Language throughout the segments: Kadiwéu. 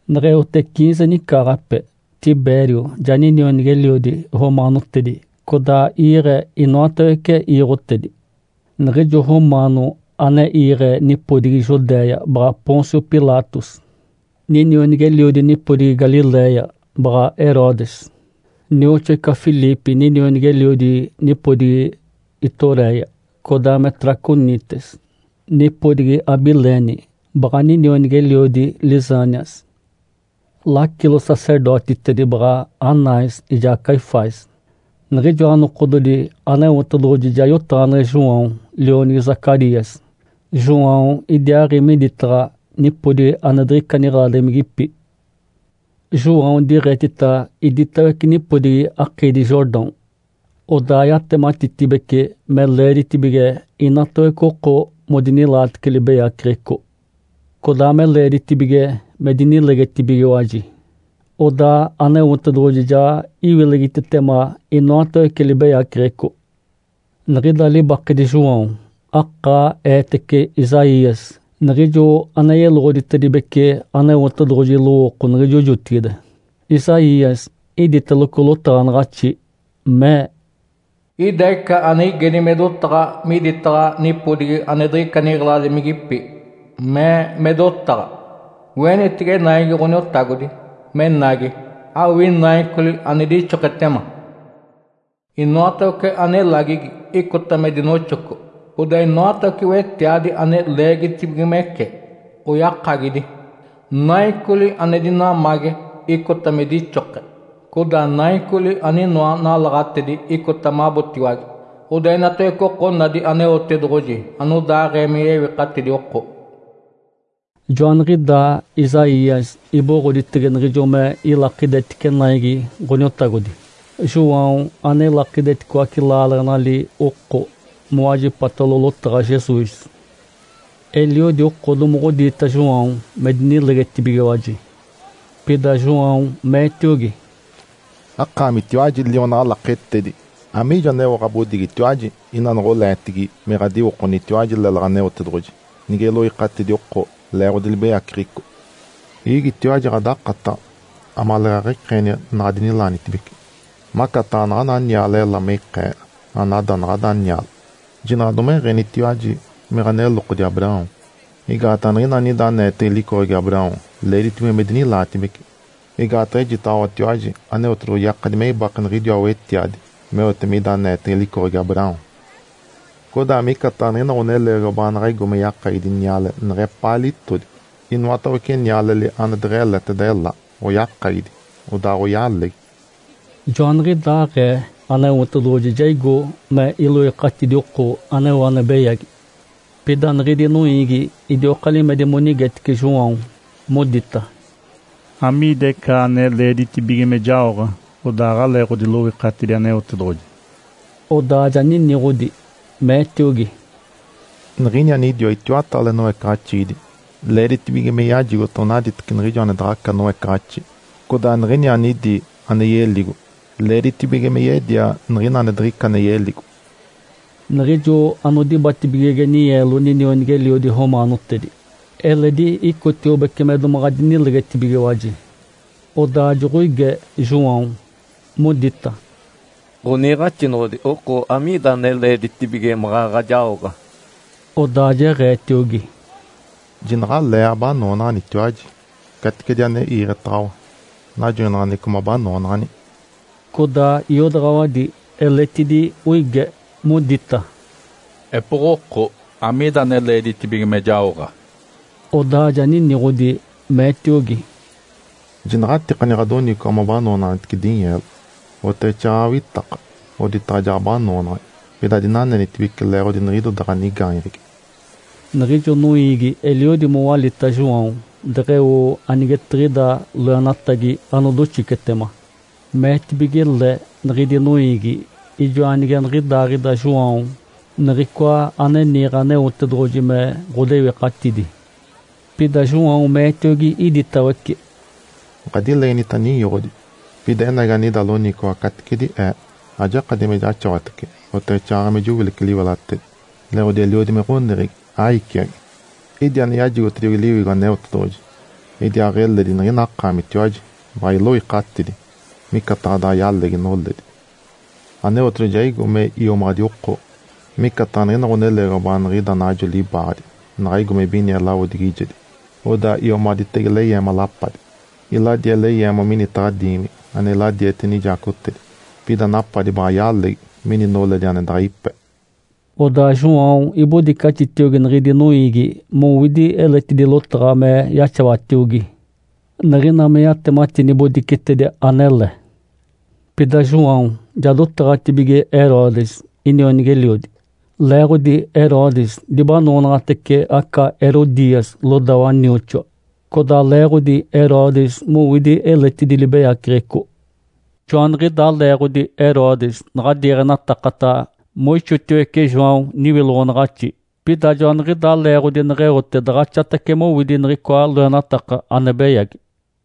Neɡ̶eote ciinze nicaaɡ̶ape Tibério ja ninionigi-eliodi romaanotedi codaa iiɡ̶e inoatawece iiɡ̶otedi. Niɡ̶ijo romaano ane iiɡ̶e nipodigi Judéia baɡ̶a Pôncio Pilatos. Ninionigi-eliodi nipodigi Galiléia baɡ̶a Herodes, nioxoa ica Filipe ninionigi-eliodi nipodigi Ituréia codaa me Traconites. Nipodigi Abilene, baɡ̶a ninionigi-eliodi Lisânias. Lacilo-sacerdotitedi baɡ̶a Anás ijaa Caifás. Niɡ̶ijoa nokododi Aneotedoɡ̶oji ja yotaɡ̶aneɡ̶e João, lionigi Zacarias. João idiaaɡ̶i miditaɡ̶a nipodigi ane diɡ̶ica niɡ̶eladimigipi. João diɡ̶etita iditawece nipodigi akiidi Jordão, odaa yatematitibece me leeditibige inatawece oko modinilaatece libeyaceɡ̶eco, codaa me leeditibige me dinilegetibigiwaji, odaa Aneotedoɡ̶oji ja iwilegitetema inoatawece libeyaceɡ̶eco. Niɡ̶ida libakedi João, akaa eetece Isaías, niɡ̶ijo ane yeloɡ̶oditedibece Aneotedoɡ̶oji lowooko niɡ̶ijo jotigide. Isaías iditeloco lotaɡ̶anaɡ̶axi, mee, “Ida ica ane igedi me dotaɡ̶a miditaɡ̶a nipodigi ane diɡ̶ica niɡ̶eladimigipi. Mee me dotaɡ̶a, ‘Oenitece naigi Ǥoniotagodi menagi, awii naicoli ane dixoketema! Inoatawece ane elagigi icota me dinoxoco, codaa inoatawece wetiadi ane leegitibigimece oyakagidi. Naicoli ane dinamage icota me dixoke, codaa naicoli aninoa nalaɡ̶atedi icota mabotiwage. Odaa inatawece oko onadi Aneotedoɡ̶oji anodaaɡ̶ee me yewikatidi oko.’” (Joaniɡ̶idaa Isaías iboɡ̶oditege niɡ̶ijo me ilakidetice naigi Ǥoniotagodi, João ane ilakideticoace laaleɡ̶enali oko mowajipatalo lotaɡ̶a Jesus.) Eliodi oko domoɡ̶odiita João me dinilegetibigiwaji. Pida João meetiogi, “Akaamitiwaji lionaɡ̶a laketedi. Amiijo aneo ɡ̶abodigitiwaji ina noɡ̶oleetigi me ɡ̶adiwokonitiwaji lélaɡ̶a Aneotedoɡ̶oji nige iloikatidi oko leeɡ̶odi libeyaceɡ̶eco? Iigitiwaji ɡ̶adakataɡ̶a amaleeɡ̶aɡ̶a ikeeni naɡ̶adinilaanitibece, macataɡ̶a naɡ̶ana niale ela me ikee anada naɡ̶ada niale. Jinaɡ̶a domeɡ̶enitiwaji me ɡ̶anelokodi Abraão, (Igaataɡ̶a niɡ̶ina anida aneetege licoɡ̶egi Abraão leeditibige me dinilaatibece), igaataɡ̶a ejitaɡ̶awatiwaji Aneotedoɡ̶oji yakadi me ibake niɡ̶idiwa wetiadi meote mida aneetege licoɡ̶egi Abraão. Codaa micataɡ̶a niɡ̶ina ɡ̶oneleegiwa baanaɡ̶a igo me yakagidi niale neɡ̶epaa litodi. Inoatawece nialeli ane deɡ̶eleteda ela oyakagidi, odaaɡ̶oyalegi.” (Joaniɡ̶idaaɡ̶ee Aneotedoɡ̶oji ja igo me iloikatidi oko aneo ane beyagi). Pida niɡ̶idi noiigi idioka limedi monigetice João, modita, “Amiida ica ane leeditibige me jaoɡ̶a? (Odaa aɡ̶alee ɡ̶odiloikatidi Aneotedoɡ̶oji.)” Odaa ja niniɡ̶odi, meetiogi, “Niɡ̶ini anidiwa itiwataale noecaɡ̶axiidi, leeditibige me yajigota onaditeci niɡ̶ijo ane daɡ̶aca noecaɡ̶axi. Codaa niɡ̶ini anidi ane yeligo, leeditibige me yedia niɡ̶ina ane diɡ̶ica ane yeligo.” Niɡ̶ijo anodibatibigege ninyeelo ninionigi-eliodi romaanotedi, eledi icotiobece me domaɡ̶aɡ̶a dinilegetibigiwaji, odaa joɡ̶oige João, modita, “Ǥoniiɡ̶axinoɡ̶odi, oko amiida ane leeditibige maɡ̶aɡ̶a jaoɡ̶a?” Odaa jeɡ̶eetiogi, “Jinaɡ̶alee abanoonaɡ̶anitiwaji caticedi ane iiɡ̶etaɡ̶awa najoinaɡ̶aneɡ̶eco mabanoonaɡ̶ani.” Codaa iodaɡ̶awadi eletidi oige, modita, “Epoɡ̶oko, amiida ane leeditibige me jaoɡ̶a?” Odaa ja niniɡ̶odi, meetiogi, “Jinaɡ̶atikani ɡ̶adoniciwaɡ̶a mabanoonaɡ̶anitece dinyeelo, oteɡ̶exaaɡ̶aɡ̶a awitaka oditaɡ̶a jaɡ̶abanoonaɡ̶ani. Pida adinanenitibece leeɡ̶odi niɡ̶idoda ɡ̶anigaanyeɡ̶egi.” Niɡ̶ijo noiigi eliodi mowalita João deɡ̶eo anigetiɡ̶ida loenatagi anodoxicetema. Meetibige le niɡ̶idi noiigi ijoa nige niɡ̶idaaɡ̶ida João Niɡ̶icoa ane niiɡ̶e Aneotedoɡ̶oji me ɡ̶odewikatidi. Pida João meetiogi iditawece, “Ǥadilegenita ninyoɡ̶odi. Pida enagi anida loniciwaɡ̶a caticedi ee. Ajakadi me jaxawatece, oteɡ̶exaaɡ̶aɡ̶a me jowilece liwelatedi, leeɡ̶odi eliodi me ɡ̶oneɡ̶egi, aiciagi. Idi ane yajigotediogi Liwigo Aneotedoɡ̶oji, idiaaɡ̶eledi niɡ̶ina akaamitiwaji baɡ̶a iloikatidi, micataɡ̶a daɡ̶a yalegi noledi. Aneotedoɡ̶oji ja igo me iomaɡ̶adi oko, micataɡ̶a niɡ̶ina ɡ̶oneleegiwa baaniɡ̶ida najo libaaɡ̶adi naɡ̶a igo me ibinie lawodigijedi, odaa iomaɡ̶aditege leyeema, lapadi. Iladie leyeema minitaɡ̶a diimigi ane iladiete nijaacotedi. Pida napadi baɡ̶a yalegi mini noledi ane daɡ̶a ipe.” Odaa João ibodicaxitiogi niɡ̶idi noiigi mowidi eletidi lotaɡ̶a me yaxawatiogi, niɡ̶ina me yatemati nibodicetedi anele. Pida João ja dotaɡ̶atibige Herodes inionigi-eliodi, leeɡ̶odi Herodes dibanoonaɡ̶atece aca Herodias lodawa nioxoa, codaa leeɡ̶odi Herodes mowidi eletidi libeyaceɡ̶eco. Joaniɡ̶idaa leeɡ̶odi Herodes naɡ̶a diiɡ̶enatakata moixotiwece João niwiloɡ̶onaɡ̶axi, pida joaniɡ̶idaa leeɡ̶odi neɡ̶eote daɡ̶axatace mowidi niɡ̶icoa loenataka ane beyagi.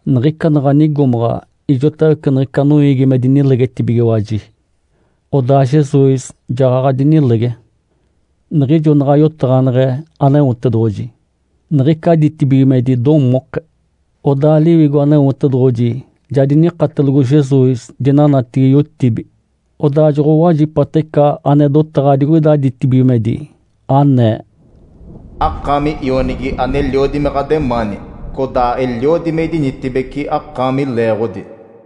Niɡ̶ica naɡ̶a nigomaɡ̶a ijotawece niɡ̶ica noiigi me dinilegetibigiwaji, odaa Jesus jaɡ̶aɡ̶a dinilege. Niɡ̶ijo naɡ̶a yotaɡ̶aneɡ̶e Aneotedoɡ̶oji, niɡ̶ica ditibigimedi domoke. Odaa Liwigo Aneotedoɡ̶oji ja dinikatelogo Jesus dinanatigi yotibi. Odaa joɡ̶owajipata ica ane dotaɡ̶a digoida ditibigimedi, anee, “Akaami Ionigi aneliodi me ɡ̶ademaani, codaa eliodi me idinitibeci akaami leeɡ̶odi.”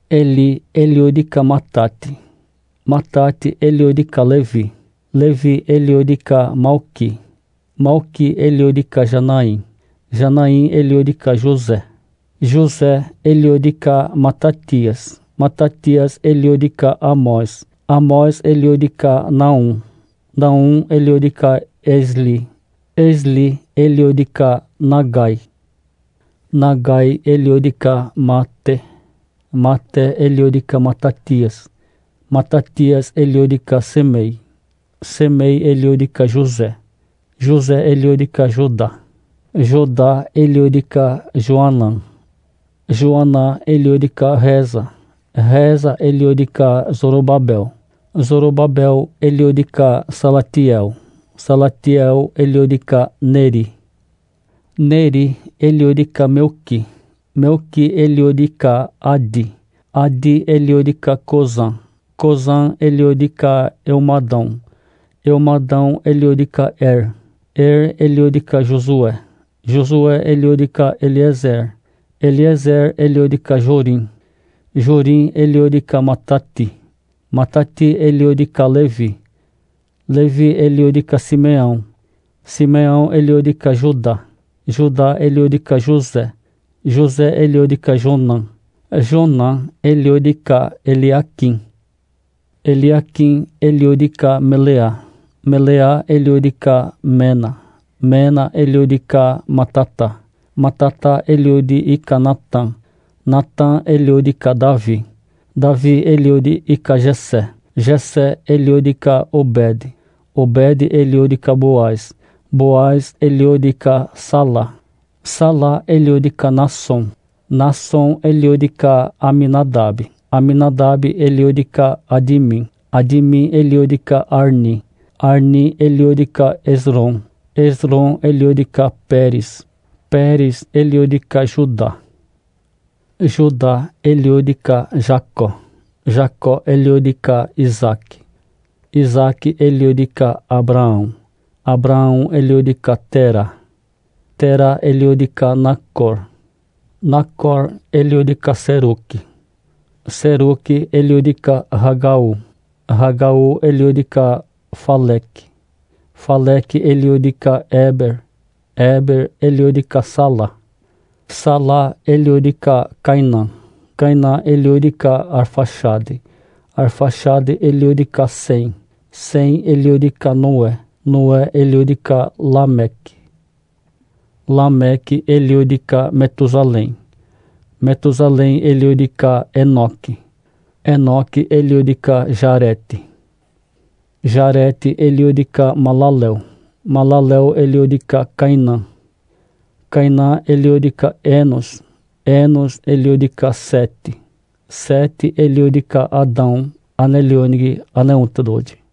Eli eliodi ica Matate, Matate eliodi ica Levi, Levi eliodi ica Malqui, Malqui eliodi ica Janai, Janai eliodi ica José, José eliodi ica Matatias, Matatias eliodi ica Amós, Amós eliodi ica Naum, Naum eliodi ica Esli, Esli eliodi ica Nagai, Nagai eliodi ica Maate, Maate eliodi ica Matatias, Matatias eliodi ica Semei, Semei eliodi ica José, José eliodi ica Joda, Joda eliodi ica Joanã, Joanã eliodi ica Resa, Resa eliodi ica Zorobabel, Zorobabel eliodi ica Salatiel, Salatiel eliodi ica Neri, Neri eliodi ica Melqui, Melqui eliodi ica Adi, Adi eliodi ica Cosã, Cosã eliodi ica Elmadão, Elmadão eliodi ica Er, Er eliodi ica Josué, Josué eliodi ica Eliézer, Eliézer eliodi ica Jorim, Jorim eliodi ica Matate, Matate eliodi ica Levi, Levi eliodi ica Simeão, Simeão eliodi ica Judá, Judá eliodi ica José, José eliodi ica Jonã, Jonã eliodi ica Eliaquim, Eliaquim eliodi ica Meleá, Meleá eliodi ica Mena, Mena eliodi ica Matata, Matata eliodi ica Natã, Natã eliodi ica Davi, Davi eliodi ica Jessé, Jessé eliodi ica Obede, Obede eliodi ica Boaz, Boaz eliodi ica Sala, Sala eliodi ica Nassom, Nassom eliodi ica Aminadabe, Aminadabe eliodi ica Admim, Admim eliodi ica Arni, Arni eliodi ica Esrom, Esrom eliodi ica Peres, Peres eliodi ica Judá, Judá eliodi ica Jacó, Jacó eliodi ica Isaque, Isaque eliodi ica Abraão, Abraão eliodi ica Tera, Tera eliodi ica Nacor, Nacor eliodi ica Seruque, Seruque eliodi ica Ragaú, Ragaú eliodi ica Faleque, Faleque eliodi ica Éber, Éber eliodi ica Sala, Sala eliodi ica Cainã, Cainã eliodi ica Arfaxade, Arfaxade eliodi ica Sem, Sem eliodi ica Noé, Noé eliodi ica Lameque, Lameque eliodi ica Metusalém, Metusalém eliodi ica Enoque, Enoque eliodi ica Jarete, Jarete eliodi ica Malaleel, Malaleel eliodi ica Cainã, Cainã eliodi ica Enos, Enos eliodi ica Sete, Sete eliodi ica Adão, ane lionigi Aneotedoɡ̶oji.